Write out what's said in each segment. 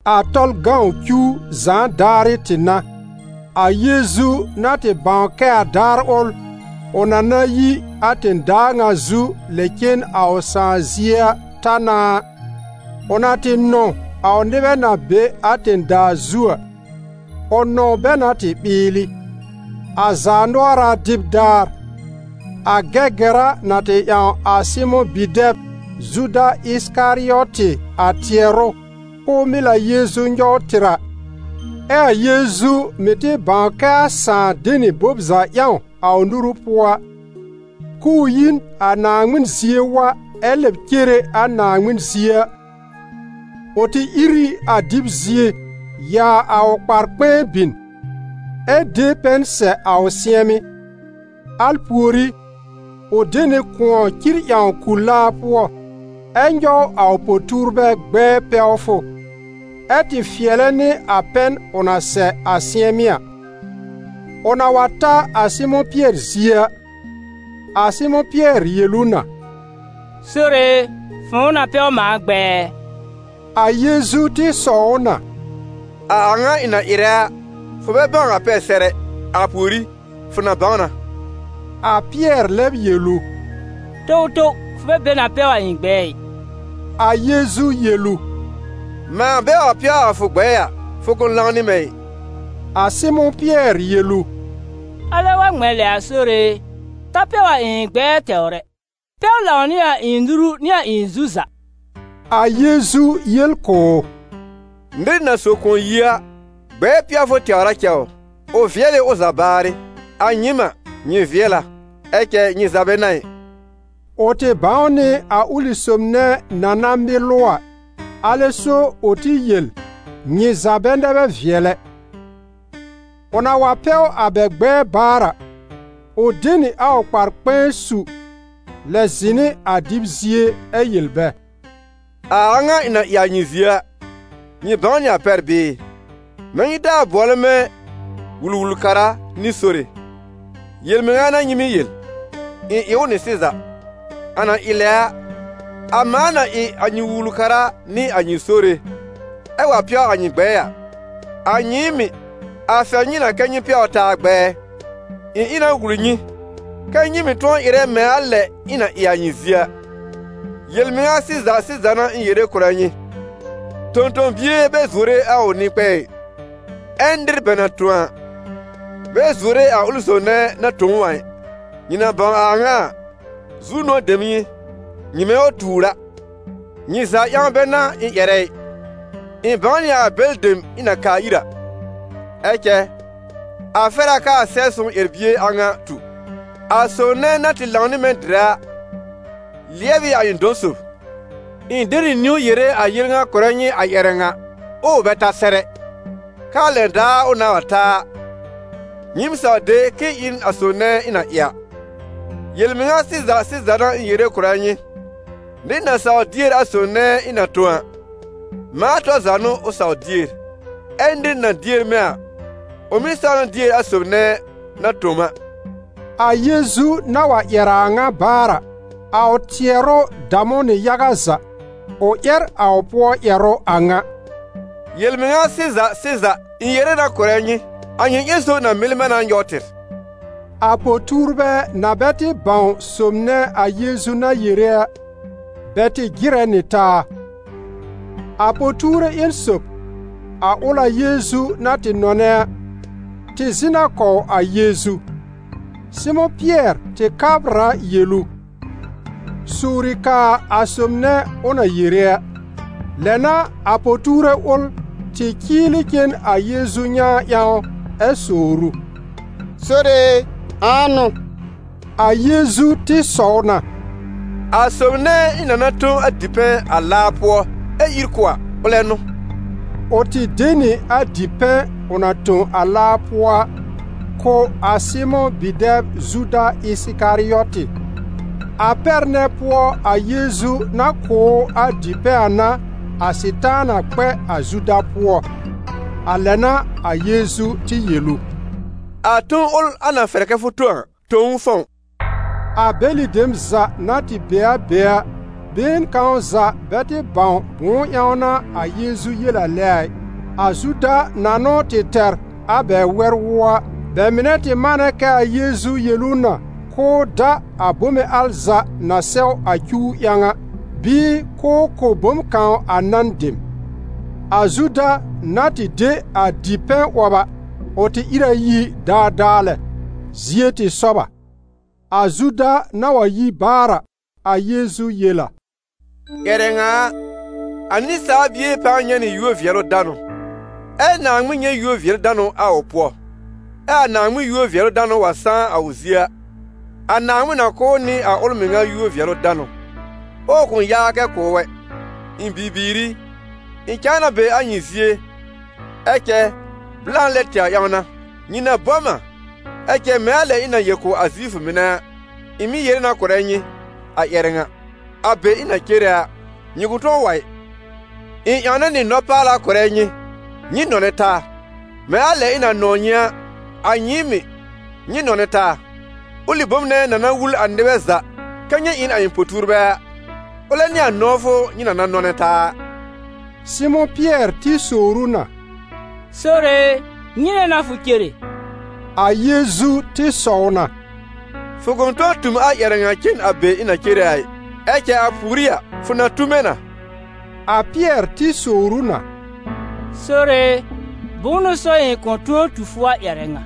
A Tɔlʋ cuw zãa daarɩ tɩ n'a. A Yeezu na tɩ bãw kɛ a daar ʋl, ʋ na na yi a tẽ-daa ŋa zu lɛ cen a ʋ Sãà zie a, ta na a, ʋ na tɩ nɔ̃w a ʋ nɩbɛ na be a tẽ-daa zu a, ʋ nɔ̃w bɛ na tɩ ɓɩɩlɩ. A zaanʋɔra dɩb daar, a Gɛgɛra na tɩ ƴãw a Sɩmʋ̃ bi-dɛb Zuda Ɩsɩkarɩɔtɩ a tɩɛrʋ k'ʋʋ mɩl a Yeezu nyɔw tɩr a, ɛ a Yeezu mɩ̀ tɩ bãw kɛ a Sãà de nɩ bom za ƴãw a ʋ nuru pʋɔ a, k'ʋʋ yi n a Naaŋmɩn zie wa ɛ lɛb cere a Naaŋmɩn zie a, ʋ tɩ ìr ɩ a dɩb zie, yaa a ʋ kpar-kpɛ̃ɛ bin, ɛ de pɛn sɛ a ʋ sɩ̃ɛmɩ́. Al pùorí, ʋ de nɩ kʋ̃ɔ cir ƴãw ku-laa pʋɔ, ɛ nyɔw a ʋ po-tuurbɛ gbɛɛ pɛwfʋ, ɛ tɩ fɩɛlɛ nɩ a pɛn ʋ na sɛ a sɩ̃ɛmɩ́ a. Ʋ na wa ta a Sɩmʋ̃ Pɩɛr zie a, a Sɩmʋ̃ Pɩɛr yel ʋ na: «Sore e, fʋ̃ʋ na pɛw mãa gbɛɛ ɛ?» A Yeezu tɩ sɔw ʋ na: «A a ŋa ɩ̃ na ɩrɛ a, fʋ bɛ bãw a pɛr sɛr ɛ, a pùorí fʋ na bãw na.» A Pɩɛr lɛb yel ʋ: «Towtow, fʋ bɛ be na pɛw a ɩ̃ gbɛɛ ɩ!» A Yeezu yel ʋ: «Mãa bɛ wa pɛw a fʋ gbɛɛ a, fʋ kʋ̃ lãw nɩ mɛ̃ ɩ.» A Sɩmʋ̃ Pɩɛr yel ʋ: «Alɛ wa ŋmɛ̃ lɛ a, Sore e, ta pɛw a ɩ̃ gbɛɛ tɛwr ɛ, pɛw lãw nɩ a ɩ̃ nuru nɩ a ɩ̃ zu za!» A Yeezu yel kʋ̀ ʋ: «Nɩr na so kʋ̃ɔ yi a, gbɛɛ pɛwfʋ tɛwr a cɛ ʋ, ʋ vɩɛl ɩ ʋ za baarɩ. A nyɩɩm a, nyɩ vɩɛl a, ɛ cɛ nyɩ za bɛ n'a ɩ.» Ʋ tɩ bãw nɩ a ʋlɩ sob nɛ na na mɩl ʋ a, alɛ so ʋ tɩ yel: «Nyɩ za bɛ nɛ bɛ vɩɛl ɛ.» Ʋ na wa pɛw bɛ a gbɛɛ baar a, ʋ de nɩ a ʋ kpar-kpɛ̃ɛ su, lɛb zɩ̃ nɩ a dɩb zie, ɛ yel bɛ: «A a ŋa ɩ̃ na ɩ a nyɩ zie a, nyɩ bãw nɩ a pɛr bɩɩ? Mɛ̃ nyɩ taa bʋɔlɛ mɛ̃ Wul-wul-kara nɩ Sore: yel-mɩŋa n'a nyɩ mɩ́ yel: ɩ̃ ɩ ʋ nɩ sɩza. A na ɩ lɛ a, a mãa na ɩ a nyɩ Wul-wul-kara nɩ a nyɩ Sore, ɛ wa pɛw a nyɩ gbɛɛ a, a nyɩɩm mɩ̀, a fɛr nyɩ na kɛ́ nyɩ mɩ̀ pɛwr taa gbɛɛ. Ɩ̃ ɩ na wul nyɩ, kɛ́ nyɩ mɩ̀ tʋ̃ɔ ɩrɛ mɛ̃ a lɛ ɩ̃ na ɩ a nyɩ zie a. Yel-mɩŋa sɩza sɩza n'a ɩ̃ yere kʋ̀rɛ nyɩ: tõ-tõ-bie bɛ zuore a ʋ nɩ-kpɛ̃ɛ ɩ, ɛ nɩr bɛ na tõ a, bɛ zuore a ʋlɩ sob nɛ na tõ ʋ a ɩ. Nyɩ na bãw a a ŋa a, zu-nʋ̃ɔ̀ dem n'ɩ nyɩ nyɩmɛ wa tuur a. Nyɩ za ƴãw bɛ n'a ɩ̃ ƴɛrɛ ɩ; ɩ̃ bãw nɩ a bɛlɩ dem ɩ̃ na kaa ir a. Ɛ cɛ a fɛr a kɛ a Sɛb-sõw ƴɛr-bie a ŋa tu: ‹A sob nɛ na tɩ lãw nɩ mɛ̃ dɩrɛ a, lɩɛb ɩ a ɩ̃ dɔ̃-sob.› Ɩ̃ de nɩ niwn yere a yel ŋa kʋ̀rɛ nyɩ a ƴɛrɛ ŋa ɛ ʋ bɛ ta sɛr ɛ, kɛ a lɛn daar ʋ nãá wa ta a, nyɩɩm saw de k'ɩ̃ɩ ‹ɩ n a sob nɛ ɩ̃ na ɩ a.› Yel-mɩŋa sɩza sɩza n'a ɩ̃ yere kʋ̀rɛ nyɩ, nɩr na sawr dier a sob nɛ ɩ̃ na tõ a, mãa tɔr za n'ʋ ʋ sawr dier, ɛ nɩr na dier mɛ̃ a, ʋ mɩ̀ saw na dier a sob nɛ na tõ m a.» A Yeezu na wa ƴɛr a a ŋa baar a, a ʋ tɩɛrʋ dam ʋ nɩ yaga za, ʋ ƴɛr a ʋ pʋɔ ƴɛrʋ a ŋa: «Yel-mɩŋa sɩza sɩza, ɩ̃ yere na kʋ̀rɛ nyɩ, a nyɩ ƴẽn sob na mɩl mɛ̃ na nyɔw tɩr.» A po-tuurbɛ na bɛ tɩ bãw sob nɛ a Yeezu na yere a, bɛ tɩ jɩrɛ nɩ taa. A po-tuure ƴẽn sob, a ʋl a Yeezu na tɩ nɔnɛ a, tɩ zɩ̃ na kɔw a Yeezu. Sɩmʋ̃ Pɩɛr tɩ kabr a yel ʋ: «Sowri kaa a sob nɛ ʋ na yere a.» Lɛ n'a a po-tuure ʋl tɩ cɩɩlɩ cen a Yeezu nyãa ƴãw ɛ sowr ʋ: «Sore e, ãa n'ʋ?» A Yeezu tɩ sɔw na: «A sob nɛ ɩ̃ na na tõ a dipɛ̃ a laa pʋɔ ɛ ír kʋ̀ a, ʋlɛ n'ʋ.» Ʋ tɩ de nɩ a dipɛ̃ ʋ na tõ a laa pʋɔ a kʋ̀ a Sɩmʋ̃ bi-dɛb Zuda Ɩsɩkarɩɔtɩ. A pɛr nɛ pʋɔ a Yeezu na kʋ̀ ʋ a dipɛ̃ a n'a a Sɩtaana kpɛ a Zuda pʋɔ. A lɛ n'a a Yeezu tɩ yel ʋ: «A ton ʋl a na fɛr kɛ fʋ tõ a, tõ ʋ fɔ̃w.» A bɛlɩ dem za na tɩ be a be a, been kãw za bɛ tɩ bãw bʋ̃ʋ ƴãw n'a a Yeezu yel a lɛ a ɩ. A Zuda na n'ʋ tɩ tɛr a wɛr-wʋɔ a, bɛ mɩnɛ tɩ manɛ kɛ a Yeezu yel ʋ na k'ʋʋ da a bome al za na sɛw a cuw ƴãw a, bɩɩ k'ʋʋ kʋ̀ bom kãw a nan dem. A Zuda na tɩ de a dipɛ̃ 'wɔb a, ʋ tɩ ìr a yi daadaa lɛ: zie tɩ sɔb a. A Zuda na wa yi baar a, a Yeezu yel a: «Ƴɛrɛ ŋa a, a Nɩsaal Bie pãa nyɛ̃ nɩ yúor-vɩɛlʋ-danʋ, ɛ Naaŋmɩn nyɛ̃ yúor-vɩɛlʋ-danʋ a ʋ pʋɔ. [Ɛ a Naaŋmɩn yúor-vɩɛlʋ-danʋ wa sãá a ʋ zie a], a Naaŋmɩn na kʋ̀ ʋ nɩ a ʋl mɩŋa yúor-vɩɛlʋ-danʋ, ɛ ʋ kʋ̃ yaa kɛ kʋ̀ ʋ ɛ. Ɩ̃ bibiir i, ɩ̃ cãa na be a nyɩ zie, ɛ cɛ blã lɛ tɛwr ƴãw n'a. Nyɩ na bɔ m a, ɛ cɛ mɛ̃ a lɛ ɩ̃ na yel kʋ̀ a Zifʋ mɩnɛ a, ɩ̃ mɩ̀ yere na kʋ̀rɛ nyɩ a ƴɛrɛ ŋa: a be ɩ̃ na cere a, nyɩ kʋ̃ tʋ̃ɔ wa ɩ. Ɩ̃ ƴãwnɛ nɩ nɔ-paala kʋ̀rɛ nyɩ: nyɩ nɔnɛ taa. Mɛ̃ a lɛ ɩ̃ na nɔ̃w nyɩ a, a nyɩɩm mɩ̀, nyɩ nɔnɛ taa. Ʋlɩ bom nɛ na na wul a nɩbɛ za kɛ nyɩ ɩ n a ɩ̃ po-tuurbɛ a, ʋlɛ n'ɩ a nɔ̃wfʋ nyɩ na na nɔ̃nɛ taa a.» Sɩmʋ̃ Pɩɛr tɩ sowr ʋ na: «Sore e, nyɩnɛ n'a fʋ cere?» A Yeezu tɩ sɔw na: «Fʋ kʋ̃ tʋ̃ɔ tu m a ƴɛrɛ ŋa cen a be ɩ̃ na cere a ɩ. Ɛ cɛ a pùorí a, fʋ na tu mɛ̃ na.» A Pɩɛr tɩ sowr ʋ na: «Sore e, bʋ̃ʋ n'ʋ so ɩ̃ kʋ̃ tʋ̃ɔ tu fʋ a ƴɛrɛ ŋa?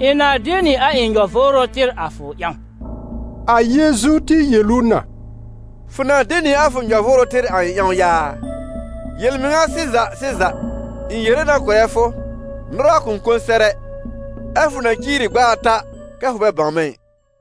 Ɩ̃ na de nɩ a ɩ̃ nyɔ-vʋʋrʋ tɩr a fʋ ƴãw!» A Yeezu tɩ yel ʋ na: «Fʋ na de nɩ a fʋ nyɔ-vʋʋrʋ tɩr a ɩ̃ ƴãw yaa? Yel-mɩŋa sɩza sɩza, ɩ̃ yere na kʋ̀rɛ fʋ, nʋra kʋ̃ kõ sɛr ɛ, ɛ́ fʋ na ciiri gb'a ata kɛ fʋ bɛ bãw mɛ̃ ɩ.»